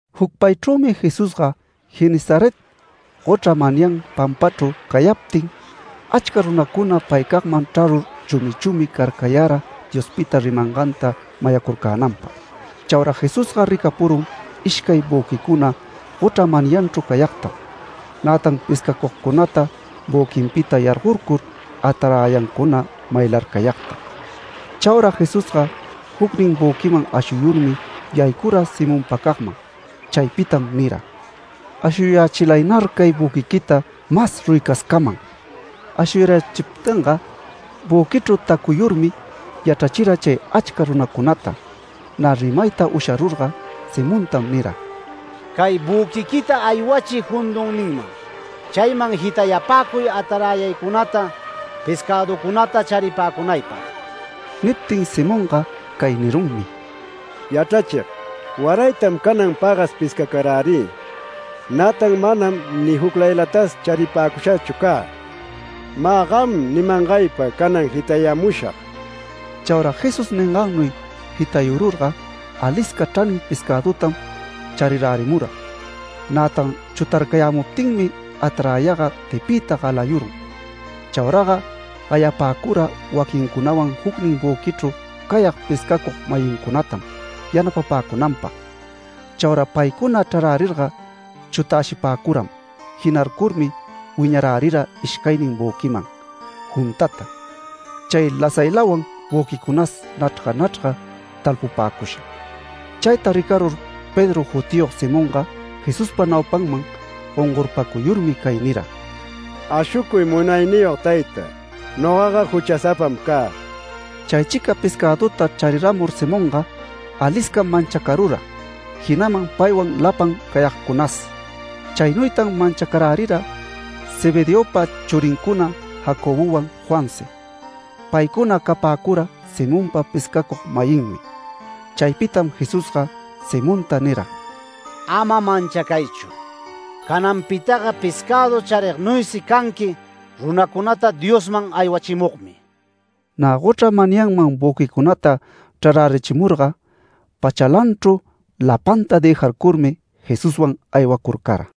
Jucpaychrümi Jesusga Genesaret gochra manyan pampachru cayaptin, achca runacuna paycagman chrarur chumi chumi carcayara Diospita rimanganta mayacurcänanpag. Chaura Jesusga ricapurun ishcay büquicuna gochra manyanchru cayagtam. Nätan pescacugcunata büquinpita yargorcur ataräyancuna maylarcayagta. Chaura Jesusga jucnin büquiman ashuyurmi yaycura Simonpacagman. Chaypitam nira: “Ashuyächilaynar cay büquiquita mas ruyicascaman”. Ashuyarachiptinga, büquichru tacuyurmi yachrachira chay achca runacunata. Nä rimayta usharurga, Simontam nira: “Cay büquiquita aywachiy jundunninman. Chayman jitayapäcuy ataräyaycunata pescäducunata charipäcunaypag”. Niptin Simonga cay nirunmi: “Yachrachig, waraytam canan pagas pescarärï. Nätan manam ni juclaylatas charipäcushachu cä. Mä gam nimangaypa canan jitayamushag”. Chaura Jesús ningannuy jitayururga alisca chranin pescädutam charirärimura. Nätan chutarcayämuptinmi ataräyaga tipiyta galayurun. Chauraga gayapäcura waquincunawan jucnin büquichru cayag pescacug-mayincunatam yanapapäcunanpag. Chaura paycuna chrarärirga chutäshipäcuram. Jinarcurmi wiñarärira ishcaynin büquiman juntata, chay lasaylawan büquicunas nachrga nachrga, talpupäcusha. Chayta ricarur Pedro jutiyog Simonga Jesuspa naupanman gongorpacuyurmi cay nira: “Ashucuy Munayniyog tayta. Nogaga juchasapam cä”. Chaychica pescäduta charirärimur Simonga aliscam manchacarura, jinaman paywan lapan cayagcunas. Chaynuytan manchacarärira Zebedeopa churincuna Jacobowan Juansi. Paycuna capäcura Simonpa pescacug-mayinmi. Chaypitam Jesusga Simonta nira: “Ama manchacaychu. Cananpitaga pescädu charignuysi canqui runacunata Diosman aywachimugmi”. Nä gochra manyanman büquicunata chrarärichimurga, pachalanchru lapanta dëjarcurmi, Jesuswan aywacurcara.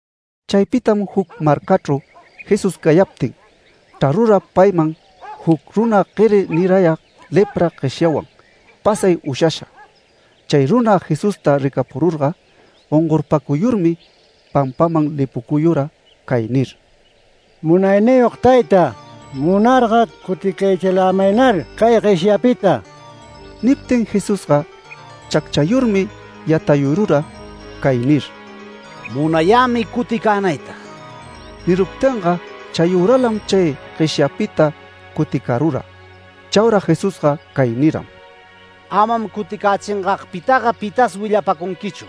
Chaypitam juc marcachru Jesús cayaptin, chrarura payman juc runa gueri nirayag lepra gueshyawan pasay ushasha. Chay runa Jesusta ricapururga, gongorpacuyurmi pampaman lipucuyura cay nir: “Munayniyog tayta, munarga cuticayächilämaynar cay gueshyapita”. Niptin Jesusga chacchayurmi yatayurura cay nir: “Munayämi cuticänayta”. Niruptinga chayüralam chay gueshyapita cuticarura. Chaura Jesusga cay niram: “Amam cuticächingagpitaga pitas willapacunquichu.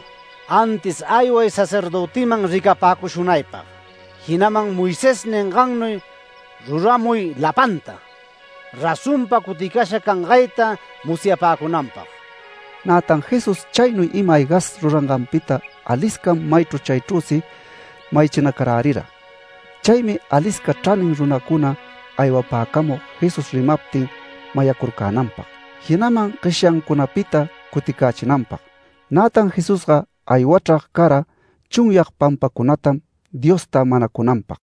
Antis ayway sacerdötiman ricapäcushunaypag, jinaman Moisés ningannuy ruramuy lapanta, razonpa cuticasha cangayta musyapäcunanpag”. Nätan Jesús chaynuy ima-aygas ruranganpita aliscam maychru chaychrüsi mayachinacarärira. Chaymi alisca chranin runacuna aywapäcamug Jesús rimaptin mayacurcänanpag, jinaman gueshyancunapita cuticächinanpag. Nätan Jesusga aywachrag cara chunyag pampacunatam Diosta manacunanpag.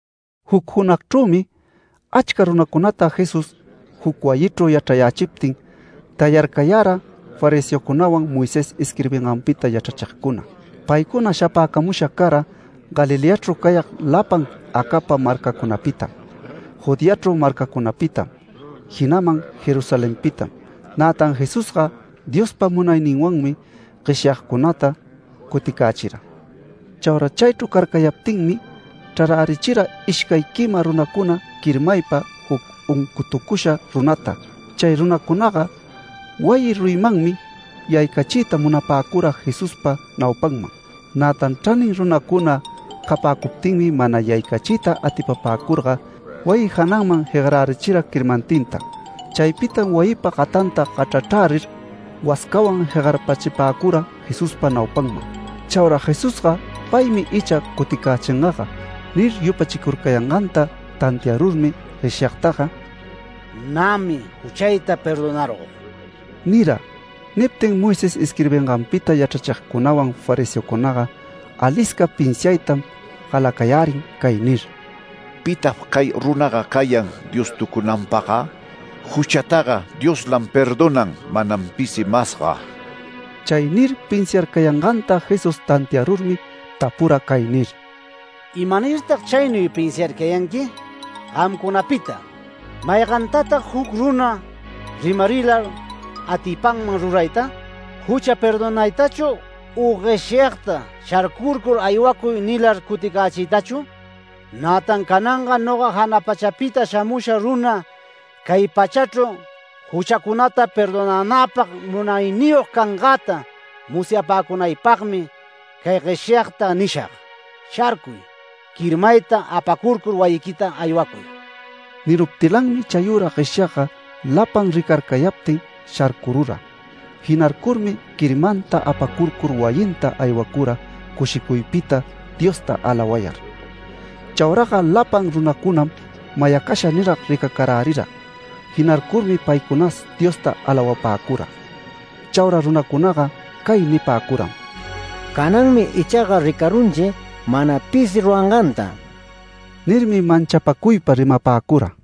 Juc junagchrümi achca runacunata Jesús juc wayichru yachrayächiptin, tayarcayara fariseocunawan Moisés isquirbinganpita yachrachigcuna. Paycuna shapäcamusha cara Galileachru cayag lapan acapa marcacunapitam, Judeachru marcacunapitam, jinaman Jerusalenpitam. Nätan Jesusga Diospa munayninwanmi gueshyagcunata cuticächira. Chaura chaychru carcayaptinmi chrarärichira ishcay quima runacuna quirmaypa juc uncutucusha runata. Chay runacunaga wayi ruyimanmi yaycachiyta munapäcura Jesuspa naupanman. Nätan chranin runacuna capäcuptinmi mana yaycachiyta atipapäcurga wayi jananman jegarärichira quirmantinta. Chaypitam wayipa gatanta gachrachrärir wascawan jegarpachipäcura Jesuspa naupanman. Chaura Jesusga “Paymi icha cuticächingaga” nir yupachicurcayanganta tantiarurmi gueshyagtaga “Nämi juchayta perdonarug” nira. Niptin Moisés isquirbinganpita yachrachigcunawan fariseocunaga alisca pinsiaytam galacayärin cay nir: “¿Pitag cay runaga cayan Diostucunanpagga? Juchataga Dioslam perdonan, manam pisi masga”. Chay nir pinsiarcayanganta Jesús tantiarurmi tapura cay nir: “¿Imanirtag chaynuy pinsiarcayanqui? Gamcunapita, ¿maygantatag juc runa rimarilar atipanman rurayta? ¿‘Jucha perdonaytachu’ u gueshyagta ‘Sharcurcur aywacuy’ nilar cuticächiytachu? Nätan cananga noga jana pachapita shamusha runa cay pachachru juchacunata perdonänäpag munayniyog cangäta musyapäcunaypagmi cay gueshyagta nishag: Sharcuy, quirmayta apacurcur wayiquita aywacuy”. Niruptilanmi chayüra gueshyagga lapan ricarcayaptin sharcurura. Jinarcurmi quirmanta apacurcur wayinta aywacura cushicuypita Diosta alawayar. Chauraga lapan runacunam mayacasha nirag ricacarärira. Jinarcurmi paycunas Diosta alawapäcura. Chaura runacunaga cay nipäcuram: “Cananmi ichaga ricarunchi mana pisi ruranganta” nirmi manchapacuypa rimapäcura.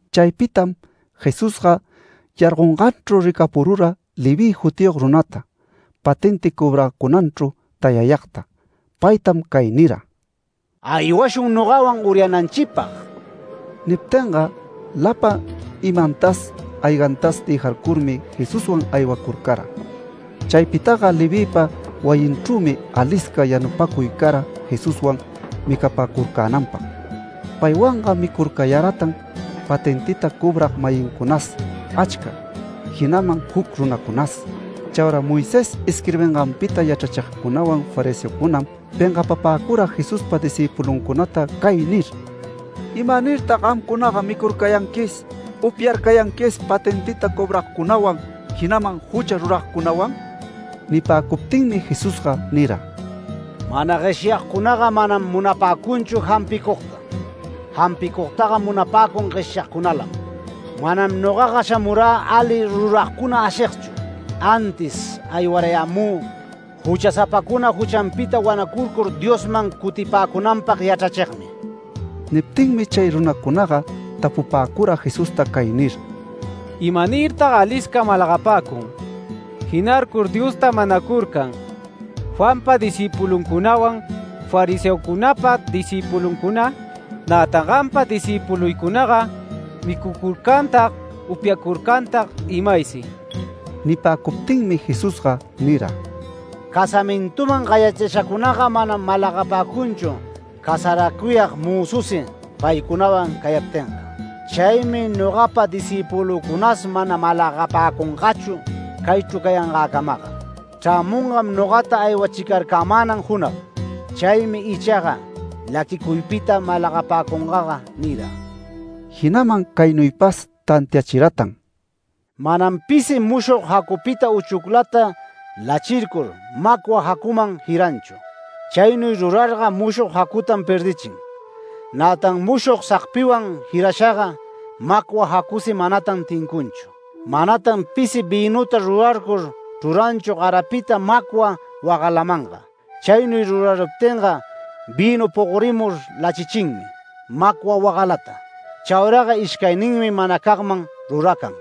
Chaypitam Jesusga yargonganchru ricapurura Leví jutiyog runata, patenti cobracunanchru tayayagta, paytam cay nira: “Aywashun nogawan uryananchipag”. Niptinga lapan imantas aygantas dëjarcurmi Jesuswan aywacurcara. Chaypitaga Levïpa wayinchrümi alisca yanupacuy cara Jesuswan micapacurcänanpag. Paywanga micurcayaratan patentita cobrag-mayincunas achca, jinaman juc runacunas. Chaura Moisés isquirbinganpita yachrachigcunawan fariseocunam pengapapäcura Jesuspa discïpuluncunata cay nir: “¿Imanirtag gamcunaga micurcayanquis, upyarcayanquis patentita cobragcunawan, jinaman jucha ruragcunawan?” Nipäcuptinmi Jesusga nira: “Mana gueshyagcunaga manam munapäcunchu jampicugta. Jampicugtaga munapäcun gueshyagcunalam. Manam nogaga shamurä ali ruragcuna ashigchu, antis aywarayämü juchasapacuna juchanpita wanacurcur Diosman cutipäcunanpag yachrachigmi”. Niptinmi chay runacunaga tapupäcura Jesusta cay nir: “¿Imanirtag alisca malagapäcun, jinarcur Diosta manacurcan Juanpa discïpuluncunawan fariseocunapa discïpuluncuna? Nätan gampa discïpuluycunaga micucurcantag, upyacurcantag imaysi”. Nipäcuptinmi Jesusga nira: “Casamintuman gayachishacunaga manam malagapäcunchu casaracuyag mözusi paycunawan cayaptinga. Chaymi nogapa discïpulücunas mana malagapäcungachu caychru cayangäcamaga. Chrämungam nogata aywachicarcamänan junag. Chaymi ichaga laquicuypita malagapäcungaga” nira. Jinaman caynuypas tantiachiratan: “Manam pisi mushog jacupita uchuclata lachircur, macwa jacuman jiranchu. Chaynuy rurarurga mushog jacutam perdichin, nätan mushog sagpiwan jirashaga macwa jacusi manatan tincunchu. Manatan pisi vïnuta rurarur chruranchu garapita macwa wagalamanga. Chaynuy ruraruptinga vïnu pogorimur lachichinmi macwa wagalata. Chauraga ishcayninmi manacagman ruracan.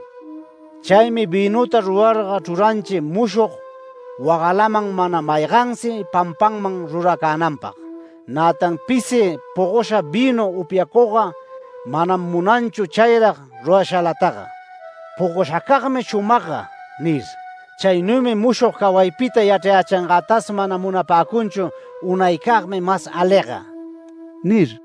Chaymi vïnuta rurarga chruranchi mushog wagalaman mana maygansi pampanman ruracänanpag. Nätan pisi pogosha vïnu upyacugga manam munanchu chayrag rurashalataga, ‘Pogoshacagmi shumagga’ nir. Chaynuymi mushog cawaypita yachrayächingätas mana munapäcunchu ‘Unaycagmi mas aliga’” nir.